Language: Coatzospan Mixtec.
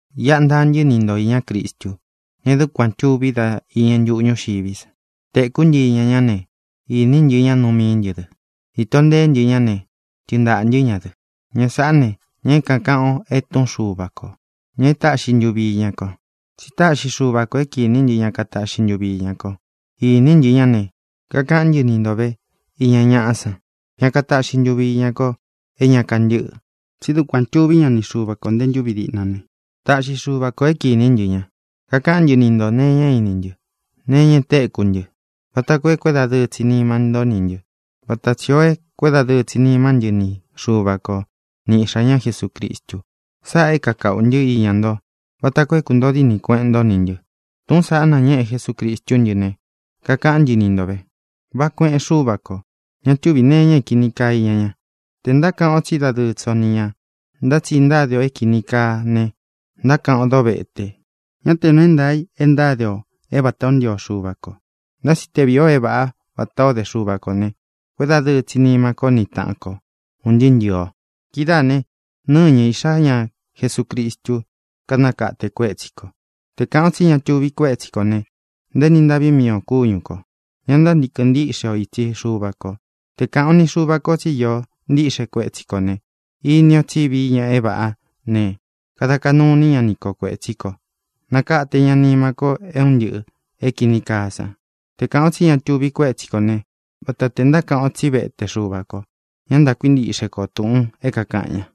Iꞌa ntaa ntɨ́ ni ntō iñá Cristu, ña é dukuān tuvi dá iñɨ ntuꞌu ñuxiví sa. Tēkú ntɨ iña ñá ne, īní ntɨ ña nuu mií ntɨ dɨ. Īto nteé ntɨ ña ne, tɨɨn ntaꞌā ntɨ́ ña dɨ. Ña sáꞌā ne, ña é kākaꞌan o e Túꞌun Xuva kō, ña e táꞌxi ntuvi iña ko. Tsi táꞌxi Xuva kō é kīní ntɨ ña kataꞌxi ntuvi iña ko. Īní ntɨ ña ne, kakaꞌán ntɨ ni ntō é nuu é ntaā i iña ña. Kakaꞌán ntɨ ni ntō ve iña ñaꞌa san, ña kataꞌxi ntuvi iña ko é ña kantɨ́ꞌɨ. Tsí dukuān tuví ña ni Xuva kō nte ntúvi díꞌna ne, táꞌxi Xuva kō é kīní ntɨ ña. Kakaꞌán ntɨ ni ntō nee iña é ini ntɨ́, nee iña e téku ntɨ́, vata koo é kuédadɨɨ tsi nima nto ní ntɨ vata tsī ó e kuédadɨɨ tsi nimá ntɨ ni Xuva ko ni Iꞌxā ñá Jesucristu. Sáꞌā é kākaꞌu ntɨ́ iña ntó vata koo é kuntōo díni kueꞌen ntó nī ntɨ. Túꞌūn saꞌá nañéꞌe Jesucristú ntɨ ne, kakaꞌán ntɨ ni nto vē. Váꞌā kueꞌen Xúva kō. Ña túvī nee iña é kīni kaa iña ña. Tē ntákaꞌan o tsí dadɨɨ tsi o ni ñā ntá tsi ntáde o é kīni kaa ne, ntákaꞌan ó dovete; ñá tē nuu é ntaā i e ntáde ō é vatā ó ntio Xuva kō. Ntá tsi te vīi o é vāꞌá vatā ó de Xuva kō ne, kuédadɨɨ tsi nima ko ni taꞌan ko un ntɨɨ́ ntɨ̄ɨ o. Kidáā ne, nɨ́ñɨ Iꞌxā ñá Jesucristu kanakate kuétsi kō. Te kāꞌan o tsí ña tuvi kuétsi kō ne, ntaéni ntaꞌví mii ō kúñu kō. Ñá ntántīkɨn ntíꞌxe o itsi Xuva kō. Te kāꞌan o ni Xuva ko tsi íō ntíꞌxe kuétsi kō ne, ini o tsi vií ña é vāꞌá ne, kada kaꞌnu iní ña ni ko kuētsí kō. Nakate ña nima ko é un ntɨꞌɨ̄ é kīni kaa san. Te kāꞌan o tsí ña tuvi kuétsi kō ne, vata tē ntákaꞌan o tsí vete Xuva kō. Ña ntákuintiꞌxe ko tūꞌun é kākaꞌan ña.